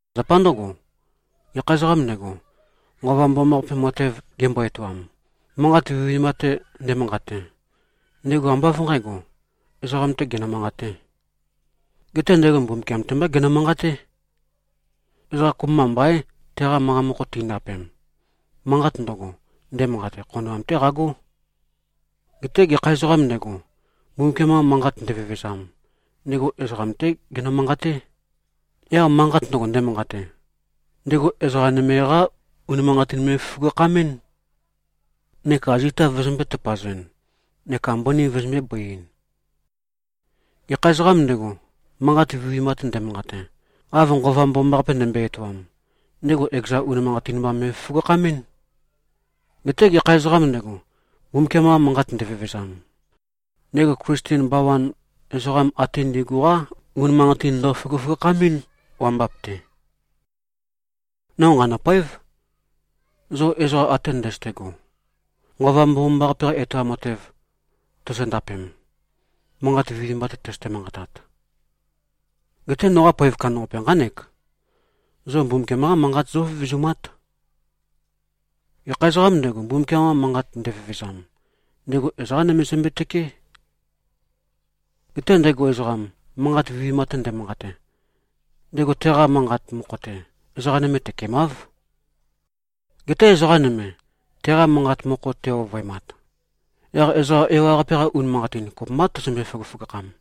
Zapa ndǿgo, gekha ezoqām ndego, Nqova Mbomambaqape matev gembo-etoam, manqat vinivinimba-te nde꞉manqate, ndego ambá av nqǣgo, ezoqam-tē genø-manqatē. Geté ndego Mbumbukiam-te mbá genø-manqaté. Ezoqa kopømba mbaín, teqa manqa mokho tindapem. Manqat ndøgo, ndemanqate, khonoam-té qagó. Geté gekha ezoqām ndego, Mbumbukiam-qa manqat ndevevezam, ndego ezoqam-té genø-manqaté. Yaq manqat ndøgo, ndemanqate, ndego ezoqá nøme-qá unimanqatin me꞉føgøføgakhamɨ́n, neka zita vøzømbē-tøpazɨn neka mbøni vøzømbē-bøiɨn. Gekha ezoqām ndego, manqat vinivinimba-te nde꞉manqate, av Nqova Mbomambaqape ndembøe-etoam, ndego ekeza unimanqatin mba me꞉føgøføgakhamɨ́n. Geté gekha ezoqām ndego, Mbumbukiam-qa manqat ndevevezam, ndego Klisten bawan ezoqam ate ndi꞉gu-qá unimanqatin ndøføgøføgakhamɨ́n, wambap-te. No nqanø̂poév, zo ezoqa ate ndøzøte꞉go, Nqova Mbomambaqape-qa etoam matev tozondapem, manqat vinivinimba-te tøzøte-manqatat. Geté noqa poev kandambaqape nqánek: Zo Mbumbukiam-qa manqat zóvevezumát. Gekha ezoqām ndego, Mbumbukiam-qa manqat ndevevezam, ndego ezoqā nøme zømbe-tøkeé. Geté ndego ezoqam, manqat vinivinimba-te nde꞉manqate, ndego teqa manqat mokho-te, ezoqa nøme tøkemáv. Geté ezoqa nøme, teqa manqat mokho te-ovøemat, yaq ezoqa ewaqape-qa unimanqatin kopømbá tøzømbe-føgøføgakham.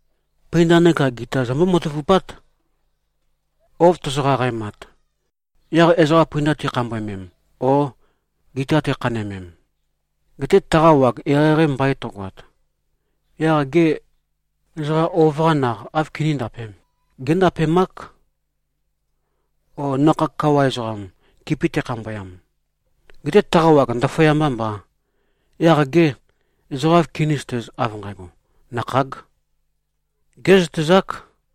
Pøinda neka gita zombó-matavupát. Ouv tozo-qaqaemat, yaq ezoqa pøinda tikhambøemem o gita tikhanøemem, gete taqa wag eqeieqei mbain tøgoat, yaq gê, ezoqa ouv-qa naq áv kiníndapēm? Géndapemák. O nakhag kawa ezoqam, kipi tekhambøyam, gete taqa wag ndaføyambā mbā, yaq gê, ezoqa áv kinízøtēz, av nqægo, nakhāg? Gézøtezák.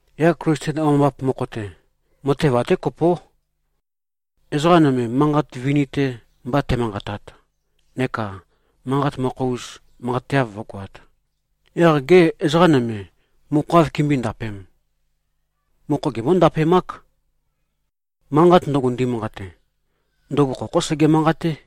Yaq Klisten wambap mokho-te, matev até kopó. Ezoqa nøme, manqat vini-te mba te꞉manqatat, neka manqat mokho-us manqateav vǿgoāt, yaq gê, ezoqa nøme mokho áv kimbǿe-ndapēm? Mokho gimbó-ndapemák. Manqat ndøgo ndemanqate, ndøgo khokhó sege-manqaté.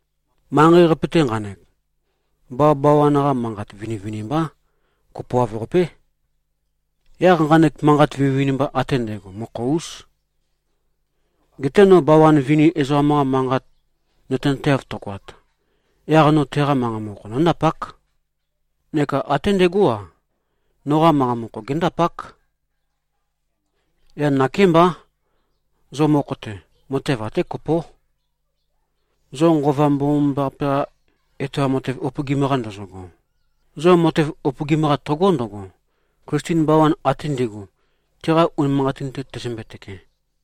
Manqei-qape-te nqanek, bawabawan-qa manqat vinivinimbá. Kopoav-qapé. Yaq nqanek manqat vinivinimba ate ndægo mokho-ús. Geté no bawa vini ezoqam-qa manqat nøtenateav tøgoat, yaq no teqa manqa mokho nóndapák, neka até ndegó-a, noqa manqa mokho géndapák. Yaq nakémbá, zo mokho-te, matev até kopó. Zo Nqova Mbomambaqape-qa etoam matev upøgim-qa ndozogo, zo matev upøgim-qa tøgó ndøgo, Klisten bawan ate ndi꞉gu, tiqa unimanqatin-te tøzømbe-tøke.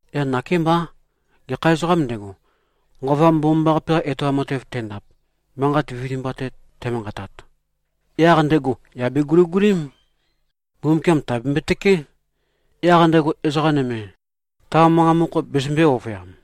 Yaq nakémbá, gekha ezoqām ndego, Nqova Mbomambaqape-qa etoam matev tendap, manqat vinivinimba-te te꞉manqatat, yaq ndego yà beguligulím, Mbumbukiam tèabembøe-tøké, yaq ndego ezoqa nøme ta manqa mokho bezømbē-ovøyam.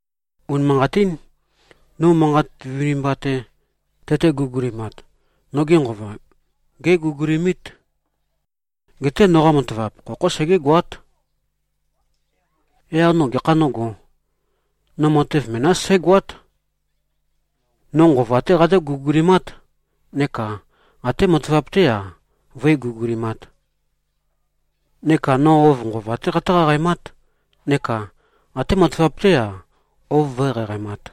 Unimanqatín. No manqat vinivinimba-te tøte-guligulimat, noge nqova géguligulimít. Geté noqa matavap, khokhó segégoát. Yaq no gekha nógō? No matev menás sǽgoát. No nqova-té qatǿ-guligulimát, neka até matavap-té-a, vǿe-guligulimāt. Neka no ouv nqova-té qatǿ-qaqaemát, neka até matavap-té-a, ouv vǿe-qaqaemāt.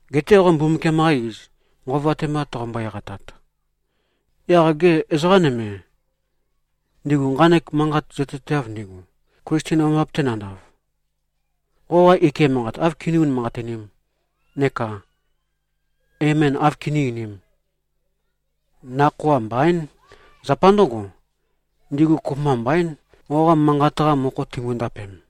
Geté qo Mbumbukiam-qa iz nqova-te mba toqombo-eqatat, yaq gê, ezoqa nøme, ndigu nqanek manqat zøtezateav ndigu, Klisten wambap-te nandav, qoqa ike manqat áv kiní-unimanqatinīm neka “Amen” áv kiní-einīm? Nakhoa mbaín. Zapa ndǿgo, ndigu kopømba mbaín, qoqa manqat-qa mokho timbo-ndapem.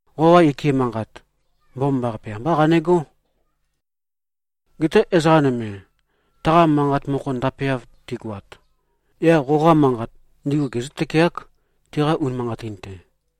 Qoqa ike manqat, mbomambaqape ambá qanegó. Geté ezoqa nøme taqa manqa mokho ndapeav tigoat, yaq qoqa manqat ndigu gezǿ-tøkeák, tiqa unimanqatin-te.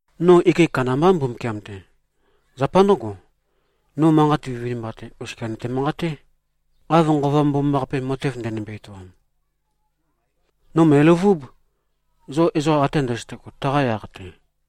No ike kandambá, Mbumbukiam-te. Zapa ndǿgo, no manqat vinivinimba-te oskia nøte-manqaté, av Nqova Mbomambaqape matev ndenømbe-etoam. No mø̀eløvúb, zo ezoqa ate ndøzøte꞉go, taqa yaq-te.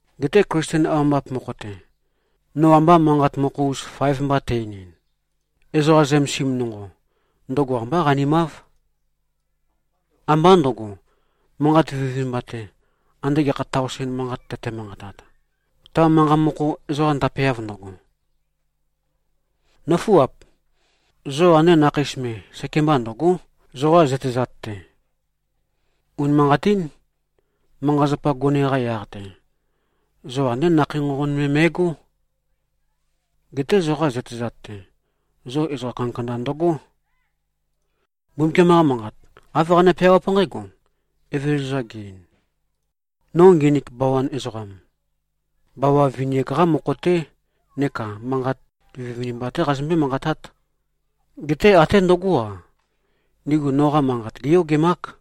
Geté Klisten wambap mokho-te, no amba manqat mokho-us faev mba tæ-einin, ezoqa zømesim nonqo, ndøgo ambá qanimáv. Ambá ndø̄go, manqat vinivinimba-te, ande gekha taosen manqat tøte-manqatat, ta manqa mokho ezoqa ndapeav ndøgo. Nǿfuap! Zo ande nakheis me, sekemba ndø̀go᷄, zoqa zøtezat-te. Unimanqatín, manqa-zapa gone-qa yaq-te, zo andé nakhei nqonqon me me꞉gó. Geté zoqa zøtezat-te, zo ezoqa kandakanda ndøgó. Mbumbukiam-qa Manqat, āv qane-peawáp nqǽgo: Evezøza ge-ein, “No nginik bawan ezoqam, bawa vini-ak-qá mokho-té neka manqat vinivinimba-té qazømbé-manqatát. Geté até ndøgó-a, ndigu noqa manqat géyogemák.”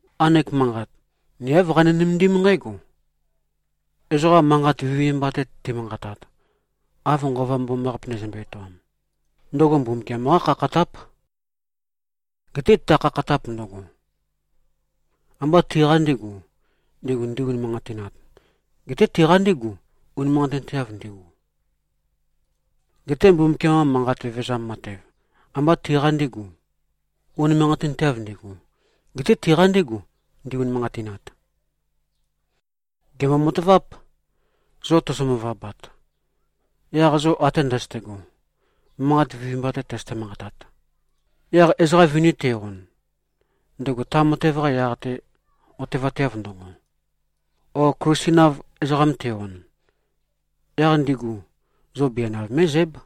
Nqanek manqat ni āv qani-nømendím nqǽgo: Ezoqa manqat vinivinimba-te ti꞉manqatat, av Nqova Mbomambaqape ndezømbe-etoam, ndøgo Mbumbukiam-qá khakhatáp. Geté ta khakhatap ndøgo, ambá tiqa ndīgu, ndigu ndi-unimanqatinat, geté tiqa ndígu, unimanqatinteav ndigu. Geté Mbumbukiam-qa manqa vevezam matev, ambá tiqa ndīgu, unimanqatinteav ndigu, geté tiqa ndígu, ndi-unimanqatinat. Gèmbo-mataváp. Zo tozo-møvabat, yaq zo ate ndøzøte꞉go, manqat vinivinimba-te tøzøte-manqatat, yaq ezoqa vini te-on, ndego ta matev-qa yaq-te otevateav ndøgo, o Klisten-av ezoqam te-on, yaq ndigu zo bianav mé꞉zǽb.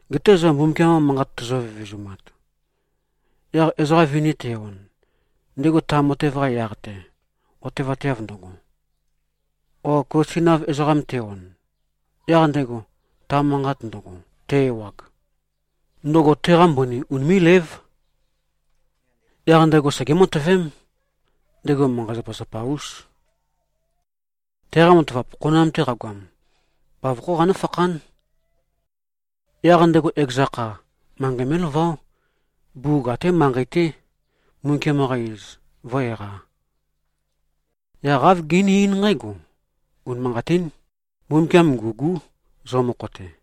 Geté zo Mbumbukiam-qa manqat tozo-vevezumat, yaq ezoqa vini te-on, ndego ta matev-qa yaq-te otevateav ndøgo, o Klisten-av ezoqam te-on, yaq ndego ta manqat ndøgo te-ewag, ndøgo teqa mbøni unimé꞉lév. Yaq ndego segé-matøvém, ndego manqa-zapazapa-ús. Teqa matavap, khonoam-te qagoam, bavokhó qanǿfakhán. Yaq ndego ekeza kha, manqei mé꞉laváo, bugug até manqei-té, Mbumbukiam-qa iz vǿ-eqā. Yaq āv gené-eín nqǽgo, “Unimanqatín. Mbumbukiam ngû꞉gú, zo mokho-te.”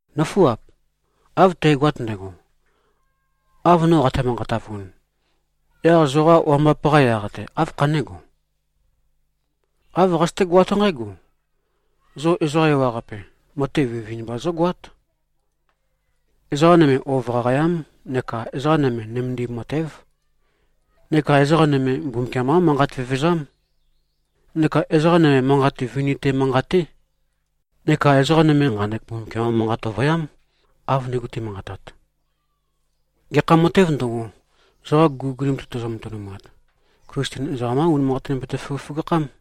Nǿfuap! Av tægoat ndægo, av no qate-manqatavun, yaq zoqa wambap-qa yaq-te, áv khané꞉go? Āv qazøtégoát nqǽgo: Zo ezoqa ewaqape matev vinivinimba zógoát. Ezoqa nøme ouv qaqayám, neka ezoqa nøme nømendim matév, neka ezoqa nøme Mbumbukiam-qá manqat vevezám, neka ezoqa nøme manqat vini-te manqaté, neka ezoqa nøme nqanek Mbumbukiam-qa manqat ovøyám, av ndigu ti꞉manqatat. Gekha matēv ndøgo, zoqa guligulim-te tozo-matønumat, Klisten ezoqam-qá unimanqatin bete-føgøføgakhám.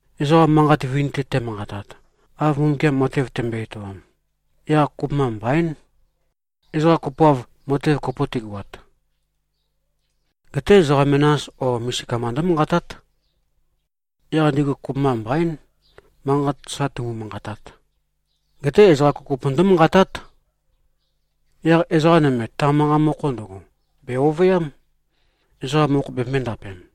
Ezoqa manqat vini-te te꞉manqatat, av Mbumbukiam matev tembøe-etoam, yaq kopømba mbaín, ezoqa kopoav matev kopo tigoat. Geté ezoqa menas o misika mba ndǿmanqatát. Yaq ndigu ezoqam kopømba mbaín, manqat sa tumu-manqatat. Geté ezoqa kopokopo ndǿmanqatát. Yaq ezoqa nøme ta manqa mokho ndøgo, bè-ovøyám, ezoqa mokho bembøē-ndapem.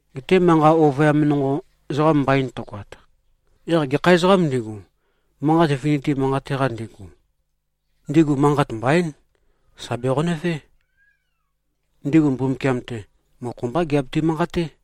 Geté manqa ovøyam nonqo ezoqam mbain tøgoat, yaq gekha ezoqām ndigu, manqat vini-te manqate-qa ndigu, ndigu manqat mbaín, sà beqonøvé. Ndigu Mbumbukiam-te, mokho mbá giabetu-manqaté.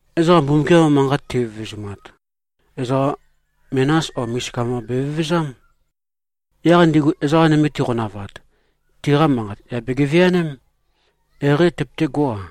Ezoqa Mbumbukiam-qa manqat tivevezumat, ezoqa menas o misika mba bevevezám. Yaq ndigu ezoqa nøme tiqonavat, tiqa manqat yà begeveaném, eqeieqei tøpøtégo-a.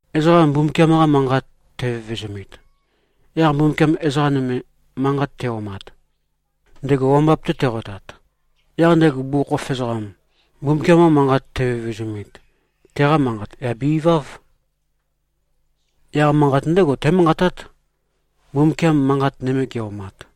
Ezoqa Mbumbukiam-qa manqat tevevezumit, yaq Mbumbukiam ezoqa nøme manqat te꞉-omat, ndego wambap-te teqotat, yaq ndego bugukhokhof ezoqam, Mbumbukiam-qa manqat tevevezumit, teqa manqat yà be-iváv. Yaq manqat ndégo témanqatát, Mbumbukiam manqat nøme ge꞉-omat.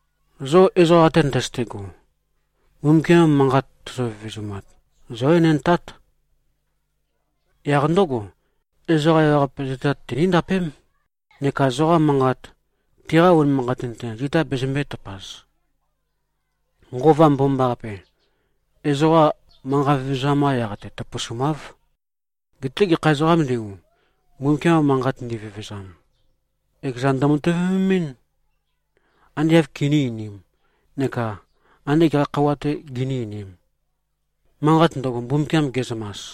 Zo ezoqa ate ndøzøte꞉go, Mbumbukiam-qa manqat tozo-vevezumat, zǿ-enendtát. Yaq ndǿgo, ezoqa ewaqape zøtezat tiníndapém, neka zoqa manqat tiqa unimanqatin-te zita bezømbē-tøpaz. Nqova Mbomambaqape, ezoqa manqa vevezam-qa yaq-te tøpøsumáv. Geté gekha ezoqām ndigu, Mbumbukiam-qa manqat ndivevezam, ekezan ndømatøvememɨ́n, ande āv kiní-einīm neka ande gekha khøuwa-tē giní-einīm, manqat ndøgo, Mbumbukiam ge꞉zømas.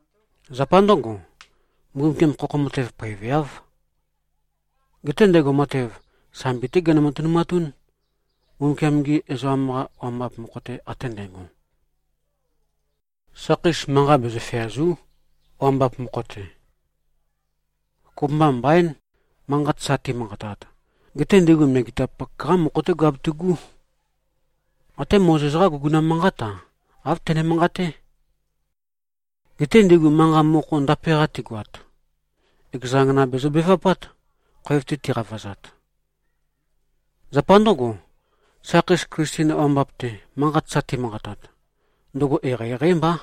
Zapa ndǿgo, Mbumbukiam, khokho matev poeveáv. Geté ndego matev, sambi-té genø-matønumatún, Mbumbukiam-gi ezoqam-qa wambap mokho-te ate ndægo. Sakheis manqa bezø-feàzu᷄, wambap mokho-te. Kopømba mbaín, manqat sa timanqatat. Geté ndigu megetapak-qá mokho-té giabetu꞉gú. Até Mozes-qá guguna manqát-a, āv tøne-manqaté. Geté ndigu manqa mokho ndape-qa tigoat, ekeza angana bezøbevapát, khoev-te tiqavazat. Zapa ndǿgo, sakheis Klisten wambap-te manqat sa timanqatat, ndøgo eqeieqeí mbá.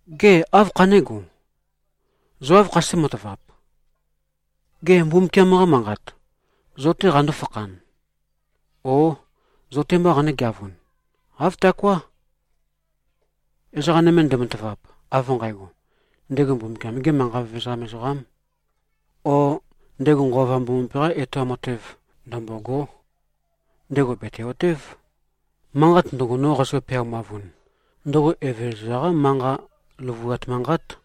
Gê, áv khané꞉go? Zo áv khazøté-matavap? Gê, Mbumbukiam-qa manqat, zo-té qandó-fakhan? O zo-te mbā qanǿgeavun? Āv taoká. Ezoqa nøme ndematavap, av nqægo, ndego Mbumbukiam-gē manqa vevezam ezoqām, o ndego Nqova Mbomambaqape-qā etoam matev ndømbôgō, ndego bète-otév, manqat ndøgo, no qazø-peaumavun, ndøgo Evezøza-qá manqa løvuat manqát.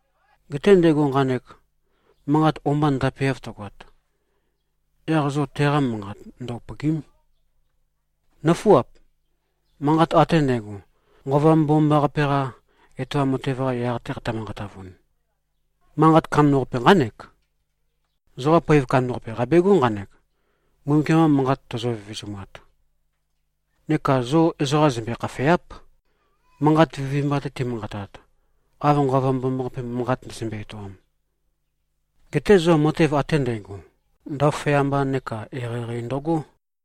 Geté ndego nqanek manqat o-mba ndapeav tøgoat, yaq zo teqa manqat ndø-upø̀gi᷄m. Nǿfuap! Manqat ate ndægo, Nqova Mbomambaqape-qa etoam matev-qa yaq-te qate-manqatavun, manqat kandambaqape nqánek: Zoqa poev kandambaqape, qabegó nqanek, Mbumbukiam-qa manqat tozo-vevezumat. Neka zo ezoqa zømbe-khafèa᷄p, manqat vinivinimba-te ti꞉manqatat, av Nqova Mbomambaqape, manqat ndezømbe-etoam. Geté zo matev ate ndægo, ndaføyamba neka eqeieqei ndøgó.